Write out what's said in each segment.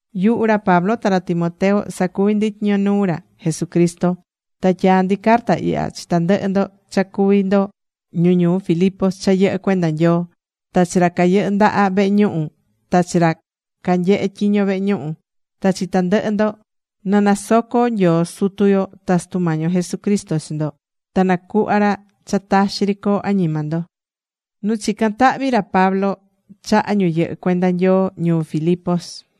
Yuhu ra Pablo ta ra Timoteo sacuví ndi tyiño nuu ra Jesucristo. Ta tyaá ndi carta ihya chi tandɨhɨ ndo cha cuví ndo ñu ñuu Filipos cha yɨhɨ́ cuenda Nyoo. Ta chi ra cayɨhɨ́ ndaha vehe ñuhu, ta chi ra canyehe tyiño vehe ñuhu, ta chi tandɨhɨ ndo. Na nasoco Nyoo Sutu yo ta Sutu Mañi yo Jesucristo chi ndo. Ta nacuhva ra cha taxi ri coo añima ndo.Nu chicán tahvi ra Pablo chaha ñu yɨhɨ́ cuenda Nyoo ñuu Filipos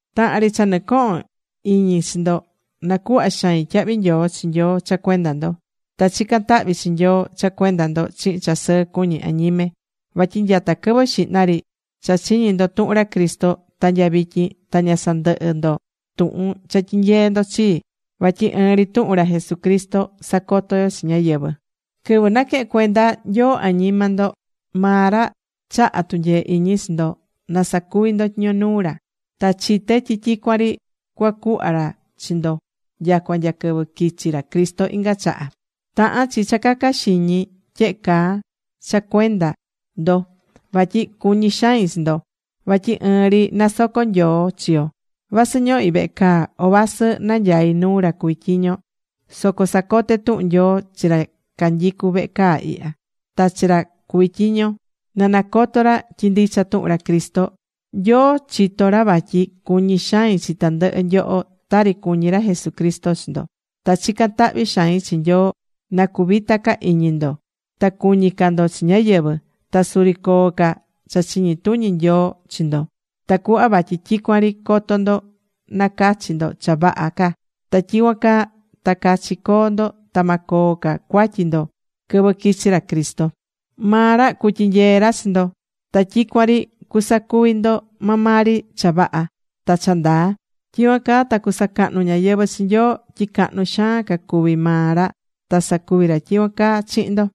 Tahan ri cha nɨcohón iñi chi ndo, nacuhvá xain tyahvi nyoo chi Nyoo cha cuenda ndo. Ta chicán tahvi chi Nyoo cha cuenda ndo chihin cha sɨɨ cuñí añime. Vatyi nyata quɨvɨ xihna ri cha chiñi̱ ndo tuhun ra Cristo ta nya vityin ta ña sandɨhɨ́ ndo tuhun cha tyinyeé ndo chii. Vatyi ɨɨn ri tuhun ra Jesucristo sacotó yo chi ñáyɨvɨ. Quɨvɨ naquehe̱n cuenda Nyoo añima ndo, maa ra chaha̱ tunyee iñi chi ndo, na sacuvi ndo tyiño nuu ra. Ta chité tyi tyicuan ri cuacuhva ra chi ndo nyacua nya quɨvɨ quichi ra Cristo inga chaha. Tahán chi cha caca xiñi tyehe caa cha cuenda ndo, vatyi cuñí xain chi ndo. Vatyi ɨɨn ri nasocó Nyoo chi yo. Vasɨ ñohí vehe caa, o vasɨ nanyaí nuu ra cuví tyiño, soco sacoté tuhun Nyoo chi ra canyicú vehe caa ihya, ta chi ra cuví tyiño, na cacoto ra tyi ndicha tuhun ra Cristo. Nyoo chitó ra vatyi cuñí xain chi tandɨhɨ nyoho tari cuñí ra Jesucristo chi ndo. Ta chicán tahvi xain chi Nyoo na cuvita ca iñi ndo, ta cuñi ca ndo chi ñáyɨvɨ. Ta suri coo ca cha chiñi tuñi Nyoo chi ndo, tacuhva vatyi tyicuan ri coto ndo nacachi ndo cha vaha ca. Ta tyicuan caa ta cachi coo ndo ta ma coo ca cuatyi ndo quɨvɨ quichi ra Cristo. Maa ra cutyinyee ra chi ndo. Ta tyicuan ri cusacuvi ndo maa maa ri cha vaha, ta cha ndaa. Tyicuan caa ta cusacahnu ñáyɨvɨ chi Nyoo tyi cahnu xaan ca cuví maa ra ta sacuví ra tyicuan caa chihin ndo.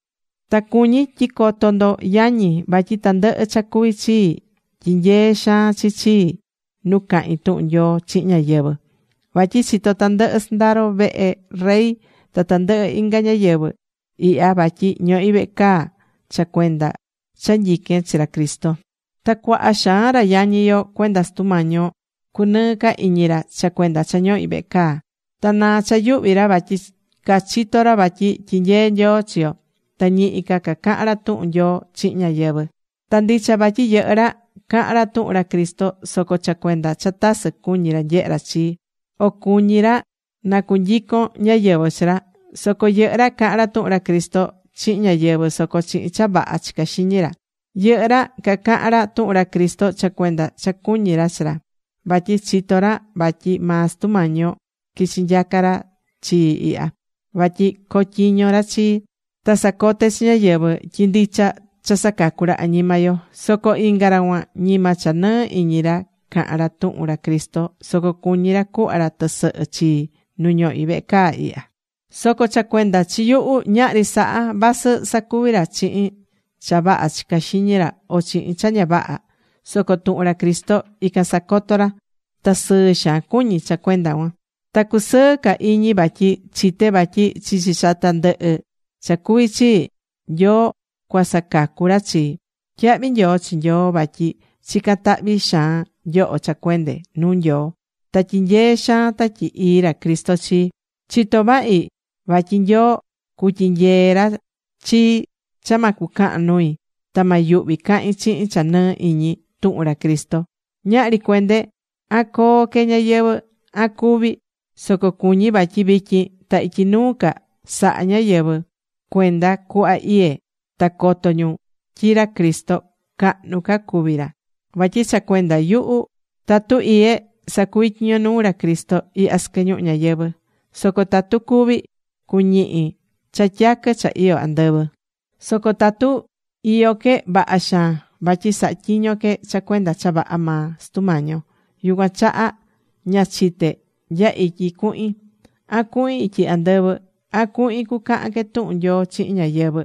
Ta cuñí tyi coto ndo yañi vatyi tandɨhɨ cha cuví chii tyinyeé xaan chi chii nu cahín tuhun Nyoo chihin ñáyɨvɨ. Vatyi chitó tandɨhɨ sɨndaro vehe rey ta tandɨhɨ inga ñáyɨvɨ ihya vatyi ñohí vehe caa cha cuenda cha nyiquén chi ra Cristo. Ta cuaha xaan ra yañi yo cuenda Sutu Mañi yo cunɨɨ́ ca iñi ra cha cuenda cha ñohí vehe caa. Ta naá cha yuhvi ra vatyi cachitó ra vatyi tyinyeé Nyoo chi yo. Ta ñihi ca cacahán ra tuhun Nyoo chihin ñáyɨvɨ. Ta ndicha vatyi yɨhɨ́ ra, cahán ra tuhun ra Cristo soco cha cuenda cha tasɨ cuñí ra nyehé ra chii, o cuñí ra na cunyicon ñáyɨvɨ chi ra. Soco yɨhɨ́ ra cahán ra tuhun ra Cristo chihin ñáyɨvɨ, soco chihin cha vaha chicá xiñi ra. Yɨhɨ́ ra cacahán ra tuhun ra Cristo cha cuenda cha cuñí ra chi ra. Vatyi chitó ra vatyi maa Sutu Mañi yo quichi nyaca̱ ra chii ihya. Vatyi cotyiño ra chii, ta sacoté chi ñáyɨvɨ tyi ndicha cha sacacú ra añima yo. Soco inga ra cuan ñima cha nɨɨ iñi ra cahán ra tuhun ra Cristo, soco cuñí ra cuhva ra tɨsɨhɨ chii nu ñohí vehe caa ihya. Soco cha cuenda chi yuhu ñahri saha, vasɨ sacuví ra chihin cha vaha chicá xiñi ra o chihin cha ña vaha. Soco tuhun ra Cristo ican casacotó ra. Ta sɨɨ xaan cuñí cha cuenda cuan. Ta cusɨɨ ca iñi vatyi chité vatyi chichi cha tandɨhɨ cha cuví chii, Nyoo cuasacacu ra chii. Tyahvi nyoo chi Nyoo vatyi chicán tahvi xaan nyoho cha cuende nuu Nyoo. Ta tyinyeé xaan Tatyi Ii ra Cristo chii. Chitó vahi vatyi Nyoo cutyinyee ra chii cha ma cucahan nui, ta ma yuhvi cahín chihin cha nɨɨ́ iñi tuhun ra Cristo. Ñahri cuende, an coo que ñayɨvɨ̱, an cúvi, soco cuñí vatyi vityin ta ityi nuu ca sa̱ha ñáyɨvɨ cuenda cuhva iyé ta coto ñu tyi ra Cristo cahnu ca cuví ra. Vatyi cha cuenda yuhu tatu iyé, sacuvi tyiño nuu ra Cristo ihya sɨquɨ ñuhu ñayɨvɨ̱. Soco tatu cúvi, cuñihi cha tyaquɨ cha iyó andɨvɨ. Soco tatu iyó que, vaha xaan. Vatyi sahá tyiño que cha cuenda cha vaha maa Sutu Mañi yo. Yucuan chaha ña chité nya ityi cuhin, an cuhin ityi andɨvɨ, an cuhin cucahan que tuhun Nyoo chihin ñáyɨvɨ,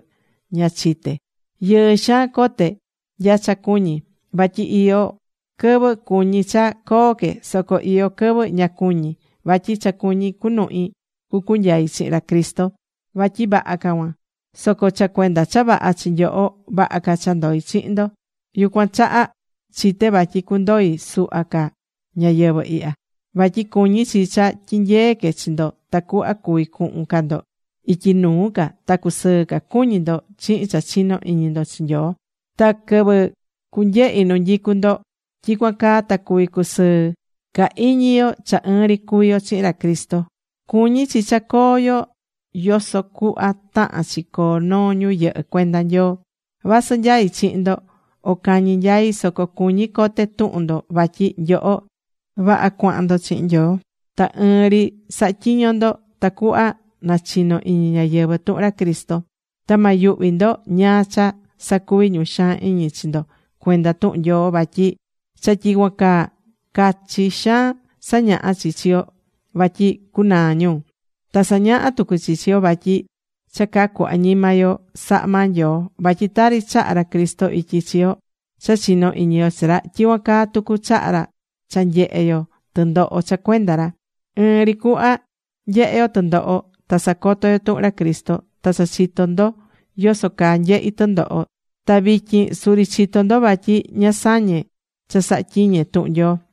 ña chité. Yɨɨ xaan cote nya cha cuñí, vatyi iyó quɨvɨ cuñí cha coo que. Soco iyó quɨvɨ ña cuñí. Vatyi cha cuñí cunuhi cucunyai chihin ra Cristo. Vatyi vaha ca cuan. Soco cha cuenda cha vaha chi nyoho, vaha ca cha ndoí chihin ndo. Yucuan chaha chité vatyi cundoi suhva ca ñayɨvɨ̱ ihya. Vatyi cuñí chi cha tyinyeé que chi ndo tacuhva cuvi cuhun ca ndo ityi nuu ca ta cu sɨɨ cuñí ndo chihin cha chinó iñi ndo chi Nyoo. Ta quɨvɨ cunyehi nu nyicu ndo, tyicuan caa ta cuvi cusɨɨ ca iñi yo cha ɨɨn ri cuví yo chihin ra Cristo. Cuñí chi cha coo yo yoso cuhva tahán chi coo noo ñu yɨhɨ́ cuenda Nyoo. Vasɨ nyaí chihin ndo, o cañi nyaí, soco cuñí cote tuhun ndo vatyi nyoho vaha cuahan ndo chihin Nyoo. Ta ɨɨn ri sahá tyiño ndo tacuhva nachino iñi ñáyɨvɨ tuhun ra Cristo. Ta ma yuhvi ndo ñáá cha sacuví ñu xaan iñi chi ndo cuenda tuhun Nyoo. Vatyi cha tyicuan caa, cachi xaan sañahá chi chi yo vatyi cunaa ñu. Ta sañahá tucu chi chi yo vatyi cha cacú añima yo sahá maa Nyoo. Vatyi tari chahá ra Cristo ityi chi yo cha chinó iñi yo chi ra, tyicuan caa tucu chahá ra cha nyehé yo tɨndoho cha cuenda ra. Ɨɨn ri cuhva nyehé yo tɨndoho ta sacotó yo tuhun ra Cristo, ta cha chitó ndo yoso caa nyehi̱ tɨndoho, ta vityin suri chitó ndo vatyi ña sañé cha sahá tyiñe tuhun Nyoo.